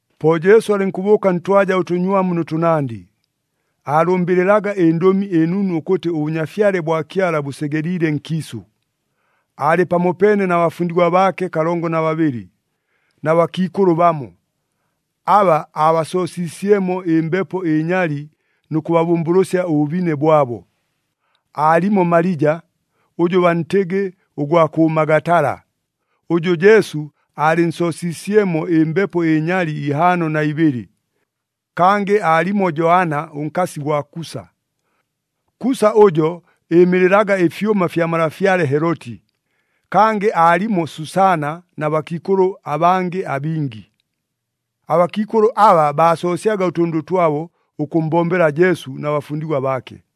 Po Jesu alɨnkʉbʉʉka ntwaja ʉtʉnywamu nʉ tʉnandɨ, aalʉmbɨlɨlaga ɨNdʉmi ɨNunu ʉkʉtɨ ʉBʉnyafyale bwa Kyala bʉsegeliile nkiisʉ. Aalɨ pamopeene na bafundigwa baake kalongo na babɨlɨ, na bakiikʉlʉ bamo, aba aabasoosiisyemo ɨmbepo ɨnyali nʉ kʉbabʉmbʉlʉsya ʉbʉbine bwabo. Aalimo Malija, ʉjʉ bantɨgɨ ʉgwa kʉ Magatala, ʉjʉ Jesu aalɨnsoosiisyemo ɨmbepo ɨnyali ihaano na ibɨlɨ, kangɨ aalimo Joana ʉnkasi gwa Kusa. Kusa ʉjo ɨɨmɨlɨlaga ɨfyʉma fya malafyale Heloti. Kangɨ aalimo Susaana na bakiikʉlʉ abangɨ abingi. Abakiikʉlʉ aba baasoosyaga ʉtʉndʉ twabo ʉkʉmmbombela Jesu na bafundigwa baake.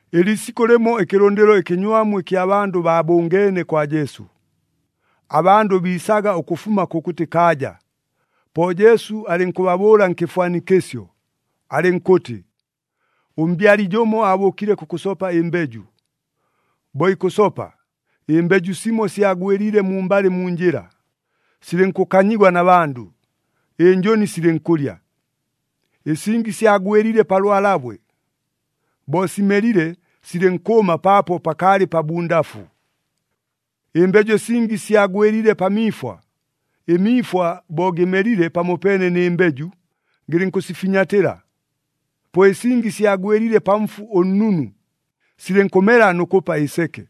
Ɨliisikʉ lɨmo ɨkɨlʉndɨlo ɨkɨnywamu ɨkya bandʉ baabʉngeene kwa Jesu, abandʉ biisaga ʉkʉfuma kʉkʉtɨ kaaja. Po Jesu alɨnkʉbabʉʉla nkɨfwanikɨsyo, alɨnkʉtɨ, “Ʉmbyali jʉmo aabʉʉkile kʉkʉsopa ɨmbeju. Bo ikʉsopa, ɨmbeju simo syagwɨliile mumbalɨ mu njɨla, silɨnkʉkanyigwa na bandʉ, ɨnjʉni silɨnkʉlya. Ɨsingi syagwɨliile pa lwalabwe. Bo simelile, silɨnkʉʉma paapo pakaalɨ pabundafu. Ɨmbeju ɨsingi syagwɨliile pa miifwa. Ɨmiifwa bo gɨmelile pamopeene nɨ mbeju, gɨlɨnkʉsifinyatɨla. Po ɨsingi syagwɨliile pa mfu ʉnnunu, silɨnkʉmela nʉ kʉpa ɨseke,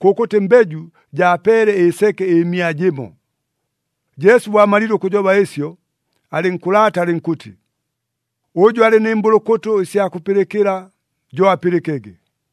kʉkʉtɨ mbeju jaapeele ɨseke ɨmia jɨmo.” Jesu bo amalile ʉkʉjoba ɨsyo, alɨnkʉlaata alɨnkʉtɨ, “Ʉjʉ alɨ nɨ mbʉlʉkʉtʉ ɨsya kʉpɨlɨkɨla, jo apɨlɨkege!”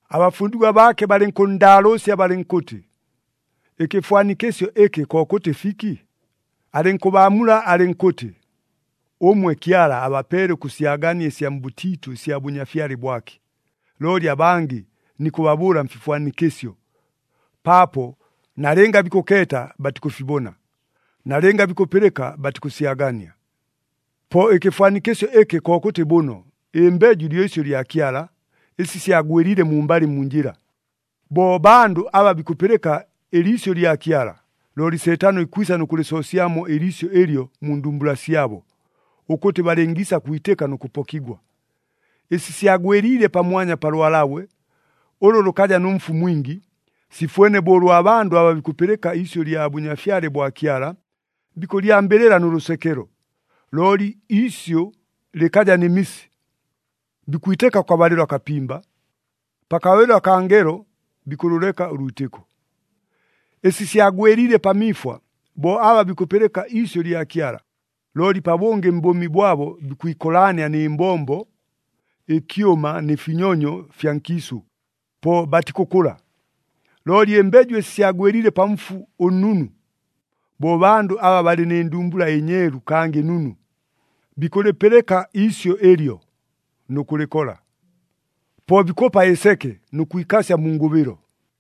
Abafundigwa baake balɨnkʉnndaalʉʉsya balɨnkʉtɨ, “Ɨkɨfwanikɨsyo ɨkɨ kokʉtɨ fiki?” Alɨnkʉbaamula alɨnkʉtɨ, “Ʉmwe Kyala abapeele ʉkʉsyagania ɨsya mbʉtiitʉ ɨsya Bʉnyafyale bwake. Looli abangɨ nikʉbabʉʉla mfifwanikɨsyo, paapo, ‘Nalɨnga bikʉkeeta, batikʉfibona. Nalɨnga bikʉpɨlɨka, batikʉsyagania.’ “Po ɨkɨfwanikɨsyo ɨkɨ kokʉtɨ bʉno. Ɨmbeju lyo isyʉ lya Kyala. Ɨsi syagwɨliile mumbalɨ mu njɨla, bo bandʉ aba bikʉpɨlɨka ɨliisyʉ lya Kyala, looli Seetano ikwisa nʉ kʉlɨsoosyamo ɨliisyʉ ɨlyo mu ndumbula syabo, ʉkʉtɨ balɨngiisa kwitɨka nʉ kʉpokigwa. Ɨsi syagwɨliile pamwanya pa lwalabwe, ʉlʉ lʉkaja nʉ mfu mwingi, sifwene bo ʉlwa bandʉ aba bikʉpɨlɨka iisyʉ lya Bʉnyafyale bwa Kyala, bikʉlyambɨlɨla nʉ lʉsekelo, looli iisyʉ lɨkaja nɨ misi. Bikwitɨka kʉkabalɨlo akapimba, pakabalɨlo akaa ngelo bikʉlʉleka ʉlwitɨko. Ɨsi syagwɨliile pa miifwa, bo aba bikʉpɨlɨka iisyʉ lya Kyala, looli pabʉngɨ mbʉʉmi bwabo bikwikolaania nɨ mbombo, ɨkyʉma nɨ finyonyo ɨfya nkiisʉ. Po batikʉkʉla. Looli ɨmbeju ɨsi syagwɨliile pa mfu ʉnnunu, bo bandʉ aba balɨ nɨ ndumbula ɨnyeelu kangɨ nunu, bikʉlɨpɨlɨka iisyʉ ɨlyo, nʉ kʉlɨkola. Po bikʉpa ɨseke nʉ kwikasya mu ngʉbɨlo.”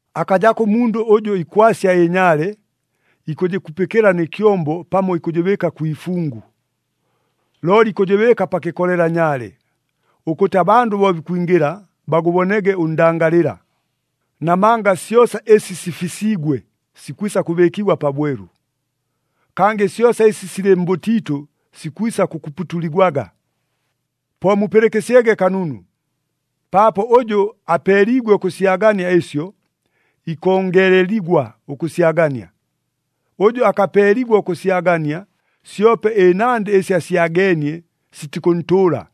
“Akajako ʉmundʉ ʉjʉ ikwasya ɨnyaale, ikʉjɨkupɨkɨla nɨ kyombo pamo ikʉjɨbɨɨka kwi ifungu. Looli ikʉjɨbɨɨka pa kɨkolela nyaale, ʉkʉtɨ abandʉ bo bikwingɨla, bagʉbonege ʉndangalɨla. Namanga syosa ɨsi sifisiigwe sikwisa kʉbɨɨkigwa pabwelu. Kangɨ syosa ɨsi silɨ mbʉtiitʉ sikwisa kʉkuputuligwaga. “Po mupɨlɨkɨsyege kanunu! Paapo ʉjʉ apeeliigwe ʉkʉsyagania ɨsyo, ikongeleligwa ʉkʉsyagania. Ʉjʉ akapeeligwa ʉkʉsyagania, syope ɨnandɨ ɨsi asyageenie sitikʉntʉʉla.”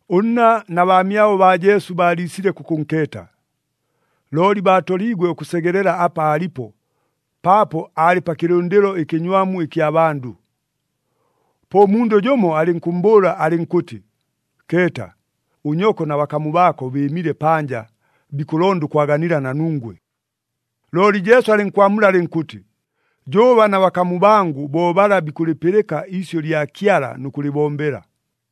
Ʉnna na baamyabo baa Jesu baaliisile kʉkʉnkeeta. Looli baatoliigwe ʉkʉsegelela apa aalipo, paapo aalɨ pa kɨlʉndɨlo ɨkɨnywamu ɨkya bandʉ. Po ʉmundʉ jʉmo alɨnkʉmmbʉʉla alɨnkʉtɨ, “Keeta! Ʉnyoko na bakamu baako bɨɨmile panja, bikʉlonda ʉkwaganila na nungwe.” Looli Jesu alɨnkwamula alɨnkʉtɨ, “Jʉʉba na bakamu bangʉ bo bala bikʉlɨpɨlɨka iisyʉ lya Kyala nʉ kʉlɨbombela.”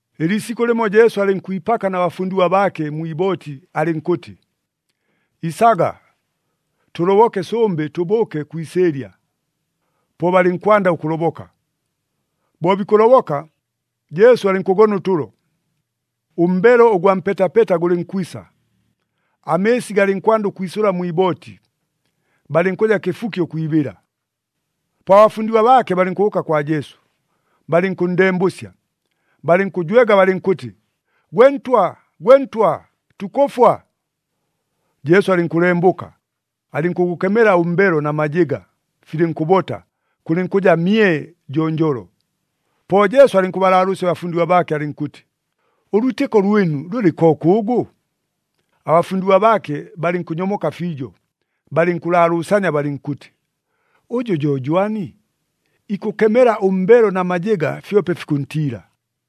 Ɨliisikʉ lɨmo Jesu alɨnkwipaka na bafundigwa baake mwi ibooti alɨnkʉtɨ, “Isaga, tʉloboke sʉmbɨ, tʉbʉʉke kwi isɨɨlya.” Po balɨnkwanda ʉkʉloboka. Bo bikʉloboka, Jesu alɨnkʉgona ʉtʉlo. Ʉmbelo ʉgwa mpetapeta gʉlɨnkwisa, amɨɨsi galɨnkwanda ʉkwisʉla mwi ibooti, balɨnkʉja kɨfuki ʉkwibɨla. Po abafundigwa baake balɨnkʉbʉʉka kwa Jesu, balɨnkʉnndembʉsya, balɨnkʉjwega balɨnkʉtɨ, “Gwe Ntwa, gwe Ntwa, tukʉfwa!” Jesu alɨnkʉlembʉka, alɨnkʉgʉkemela ʉmbelo na majɨga, filɨnkʉbota, kʉlɨnkʉja mye jonjolo. Po Jesu alɨnkʉbalaalʉʉsya abafundigwa baake alɨnkʉtɨ, “Ʉlwitɨko lwɨnu lʉlɨ kokʉʉgʉ?” Abafundigwa baake balɨnkʉnyomoka fiijo, balɨnkʉlaalʉʉsania balɨnkʉtɨ, “Ʉjʉ jo jwani? Ikʉkemela ʉmbelo na majɨga, fyope fikʉntiila!”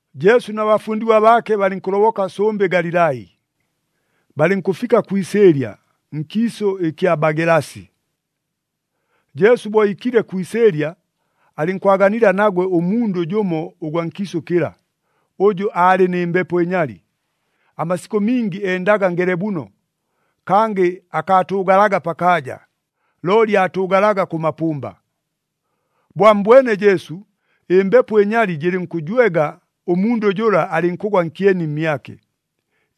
Jesu na bafundigwa baake balɨnkʉloboka sʉmbɨ Galilai, balɨnkʉfika kwi isɨɨlya, nkiisʉ ɨkya Bagelasi. Jesu bo iikile kwi isɨɨlya, alɨnkwaganila nagwe ʉmundʉ jʉmo ʉgwa nkiisʉ kɨla, ʉjʉ aalɨ nɨ mbepo ɨnyali. Amasikʉ mingi endaga ngelebuno, kangɨ akaatʉʉgalaga pakaaja, looli aatʉʉgalaga kʉ mapʉmba. Bo ammbwene Jesu, ɨmbepo ɨnyali jɨlɨnkʉjwega, ʉmundʉ jʉla alɨnkʉgwa nkyeni mmyake,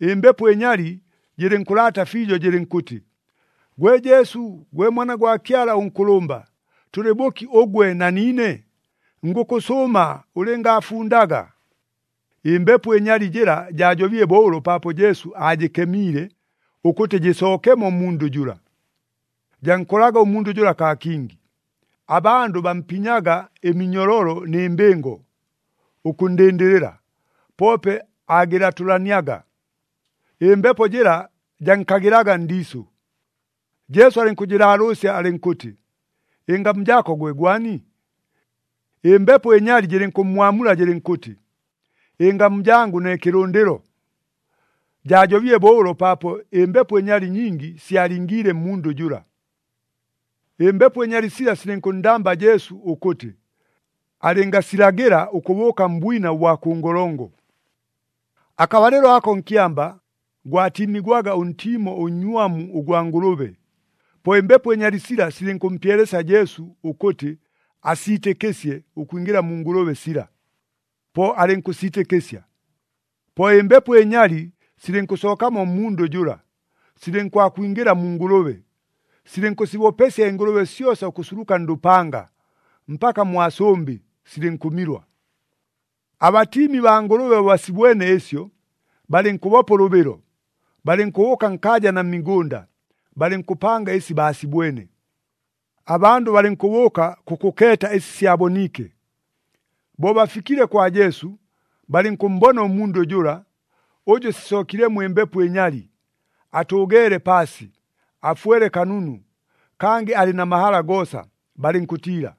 ɨmbepo ɨnyali jɨlɨnkʉlaata fiijo, jɨlɨnkʉtɨ, “Gwe Jesu, gwe Mwana gwa Kyala ʉNkʉlʉmba, tʉlɨ bʉki ʉgwe na niine? Ngʉkʉsʉʉma ʉlɨngaafundaga!” Ɨmbepo ɨnyali jɨla jaajobile bo ʉlo paapo Jesu aajɨkemiile, ʉkʉtɨ jɨsookemo mmundʉ jʉla. Jankolaga ʉmundʉ jʉla kaa kingi. Abandʉ bampinyaga ɨminyololo nɨ mbɨngo, ʉkʉnndɨndɨlɨla, poope aagɨlatʉlaniaga. Ɨmbepo jɨla jankagɨlaga ndiisʉ. Jesu alɨnkʉjɨlaalʉʉsya alɨnkʉtɨ, “Ɨngamu jaako gwe gwani?” Ɨmbepo ɨnyali jɨlɨnkʉmmwamula jɨlɨnkʉtɨ, “Ɨngamu jangʉ ne Kɨlʉndɨlo.” Jaajobile bo ʉlo paapo ɨmbepo ɨnyali nyingi syalingiile mmundʉ jʉla. Ɨmbepo ɨnyali sila silɨnkʉnndamba Jesu ʉkʉtɨ, alɨngasilagɨla ʉkʉbʉʉka mbwina ʉbwa kʉ ngolongo. Akabalɨlo ako nkyamba, gwatiimigwaga ʉntiimo ʉnnywamu ʉgwa ngʉlʉbe. Po ɨmbepo ɨnyali sila silɨnkʉmpyelesya Jesu ʉkʉtɨ, asiitɨkɨsye ʉkwingɨla mu ngʉlʉbe sila. Po alɨnkʉsiitɨkɨsya. Po ɨmbepo ɨnyali silɨnkʉsookamo mmundʉ jʉla, silɨnkwakwingɨla mu ngʉlʉbe. Silɨnkʉsibopesya ɨngʉlʉbe syosa ʉkʉsuluka ndʉpanga, mpaka mwa sʉmbɨ, silɨnkʉmilwa. Abatiimi baa ngʉlʉbe bo basibwene ɨsyo, balɨnkʉbopa ʉlʉbɨlo, balɨnkʉbʉʉka nkaaja na mmigʉnda, balɨnkʉpanga ɨsi baasibwene. Abandʉ balɨnkʉbʉʉka kʉkʉkeeta ɨsi syaboniike. Bo bafikile kwa Jesu, balɨnkʉmmbona ʉmundʉ jʉla, ʉjʉ sisookilemo ɨmbepo ɨnyali, atʉʉgeele paasi, afwele kanunu, kangɨ alɨ na mahala goosa, balɨnkʉtiila.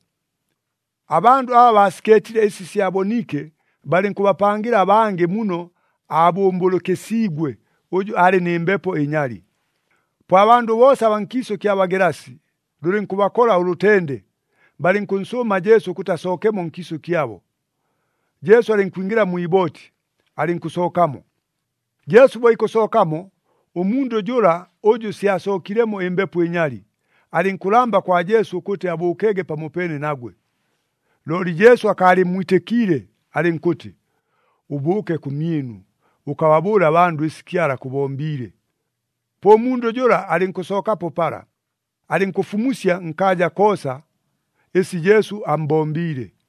Abandʉ aba baasikeetile ɨsi syaboniike, balɨnkʉbapangɨla abangɨ muno abʉmbʉlʉkɨsiigwe ʉjʉ aalɨ nɨ mbepo ɨnyali. Po abandʉ boosa abaa nkiisʉ kya Bagelasi, lʉlɨnkʉbakola ʉlʉtende, balɨnkʉnsʉʉma Jesu ʉkʉtɨ asookemo nkiisʉ kyabo. Jesu alɨnkwingɨla mwi ibooti, alɨnkʉsookamo. Jesu bo ikʉsookamo, ʉmundʉ jʉla ʉjʉ syasookilemo ɨmbepo ɨnyali, alɨnkʉlamba kwa Jesu ʉkʉtɨ abʉʉkege pamopeene nagwe. Looli Jesu akaalɨmmwitɨkiile alɨnkʉtɨ, “Ʉbʉʉke kʉmyɨnu, ʉkababʉʉle abandʉ ɨsi Kyala akʉbombiile.” Po ʉmundʉ jʉla alɨnkʉsookapo pala, alɨnkʉfumusya nkaaja koosa, ɨsi Jesu ammbombiile.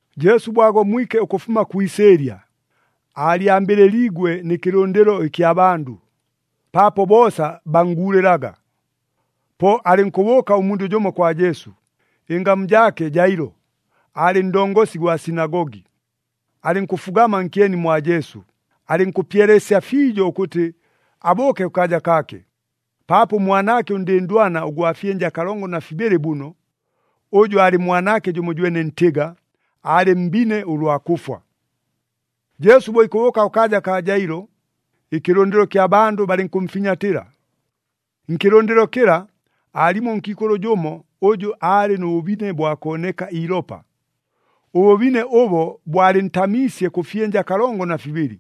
Jesu bo agomwike ʉkʉfuma kwi isɨɨlya, aalyambɨlɨliigwe nɨ kɨlʉndɨlo ɨkya bandʉ, paapo boosa bannguulɨlaga. Po alɨnkʉbʉʉka ʉmundʉ jʉmo kwa Jesu, ɨngamu jaake Jailo, aalɨ ndongosi gwa sinagogi. Alɨnkʉfugama nkyeni mwa Jesu, alɨnkʉpyelesya fiijo ʉkʉtɨ abʉʉke kʉkaaja kaake, paapo ʉmwanaake ʉndɨndwana ʉgwa fyɨnja kalongo na fibɨlɨ bʉno, ʉjʉ aalɨ mwanaake jʉmojwene ntɨga, aalɨ mbine ʉlwa kʉfwa. Jesu bo ikʉbʉʉka kʉkaaja kaa Jailo, ɨkɨlʉndɨlo kya bandʉ balɨnkʉmfinyatɨla. Nkɨlʉndɨlo kɨla, aalimo ʉnkiikʉlʉ jʉmo, ʉjʉ aalɨ nʉ bʉbine bwa kooneka iilopa. Ʉbʉbine ʉbo bwalɨntaamiisye kʉ fyɨnja kalongo na fibɨlɨ.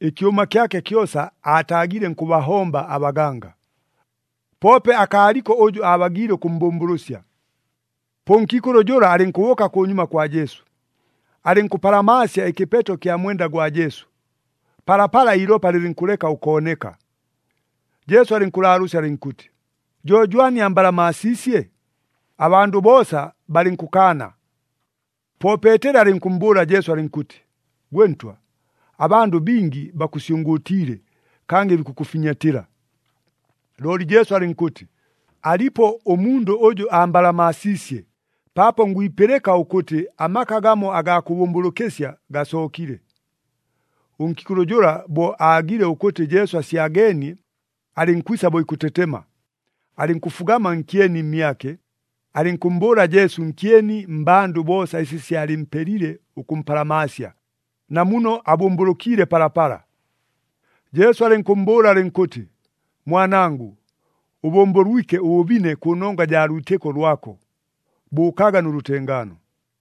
[Ɨkyʉma kyake kyosa aataagile nkʉbahomba abaganga,] poope akaaliko ʉjʉ aabagiile ʉkʉmmbʉmbʉlʉsya. Po ʉnkiikʉlʉ jʉla alɨnkʉbʉʉka kʉnyuma kwa Jesu, alɨnkʉpalamaasya ɨkɨpeto kya mwenda gwa Jesu, palapala iilopa lɨlɨnkʉleka ʉkooneka. Jesu alɨnkʉlaalʉʉsya alɨnkʉtɨ, “Jo jwani ambalamaasiisye?” Abandʉ boosa balɨnkʉkaana. Po Peeteli alɨnkʉmmbʉʉla Jesu alɨnkʉtɨ, “Gwe Ntwa, abandʉ bingi bakʉsyʉngʉʉtiile kangɨ bikʉkʉfinyatɨla.” Looli Jesu alɨnkʉtɨ, “Alipo ʉmundʉ ʉjʉ ambalamaasiisye, paapo ngwipɨlɨka ʉkʉtɨ amaka gamo agaa kʉbʉmbʉlʉkɨsya gasookile.” Ʉnkiikʉlʉ jʉla bo aagile ʉkʉtɨ Jesu asyageenie, alɨnkwisa bo ikʉtetema. Alɨnkʉfugama nkyeni mmyake, alɨnkʉmmbʉʉla Jesu nkyeni mmbandʉ boosa ɨsi syalɨmpelile ʉkʉmpalamaasya, na muno abʉmbʉlʉkiile palapala. Jesu alɨnkʉmmbʉʉla alɨnkʉtɨ, “Mwanangʉ, ʉbʉmbʉlwike ʉbʉbine kʉnongwa jaa lwitɨko lwako. Bʉʉkaga nʉ lʉtengaano!”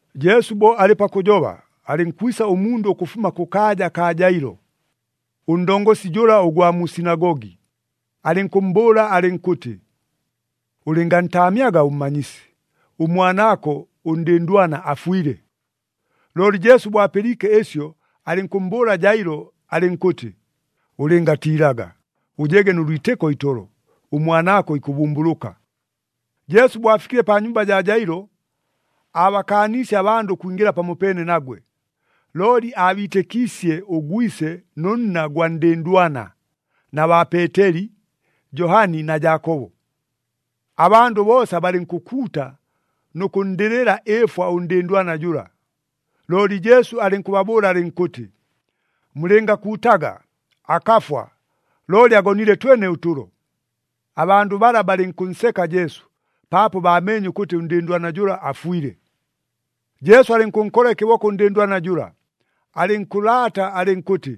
Jesu bo alɨ pakʉjoba, alɨnkwisa ʉmundʉ ʉkʉfuma kʉkaaja kaa Jailo, ʉndongosi jʉla ʉgwa mu sinagogi, alɨnkʉmmbʉʉla alɨnkʉtɨ, “Ʉlɨngantaamyaga ʉMmanyisi, ʉmwanaako ʉndɨndwana afwile.” Looli Jesu bo apɨliike ɨsyo, alɨnkʉmmbʉʉla Jailo alɨnkʉtɨ, “Ʉlɨngatiilaga, ʉjege nʉ lwitɨko itolo, ʉmwanaako ikʉbʉmbʉlʉka.” Jesu bo afikile pa nyumba jaa Jailo, aabakaaniisye abandʉ ʉkwingɨla pamopeene nagwe, looli aabiitɨkiisye ʉgwise nʉ nna gwa ndɨndwana, na baa Peeteli, Johani na Jaakobo. Abandʉ boosa balɨnkʉkuuta nʉ kʉnndɨlɨla ɨɨfwa ʉndɨndwana jʉla. Looli Jesu alɨnkʉbabʉʉla alɨnkʉtɨ, “Mulɨngakuutaga! Akafwa, looli agonile twene ʉtʉlo.” Abandʉ bala balɨnkʉnseka Jesu, paapo baameenye ʉkʉtɨ ʉndɨndwana jʉla afwile. Jesu alɨnkʉnkola ɨkɨboko ʉndɨndwana jʉla, alɨnkʉlaata alɨnkʉtɨ,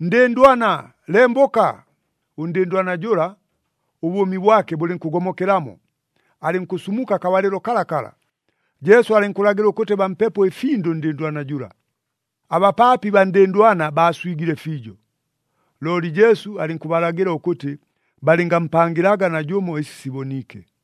“Ndɨndwana, lembʉka!” Ʉndɨndwana jʉla, ʉbʉʉmi bwake bʉlɨnkʉgomokelamo, alɨnkʉsumuka akabalɨlo kalakala. Jesu alɨnkʉlagɨla ʉkʉtɨ bampepo ɨfindʉ ʉndɨndwana jʉla. Abapaapi baa ndɨndwana baaswigile fiijo. Looli Jesu alɨnkʉbalagɨla ʉkʉtɨ balɨngampangɨlaga najʉmo ɨsi siboniike.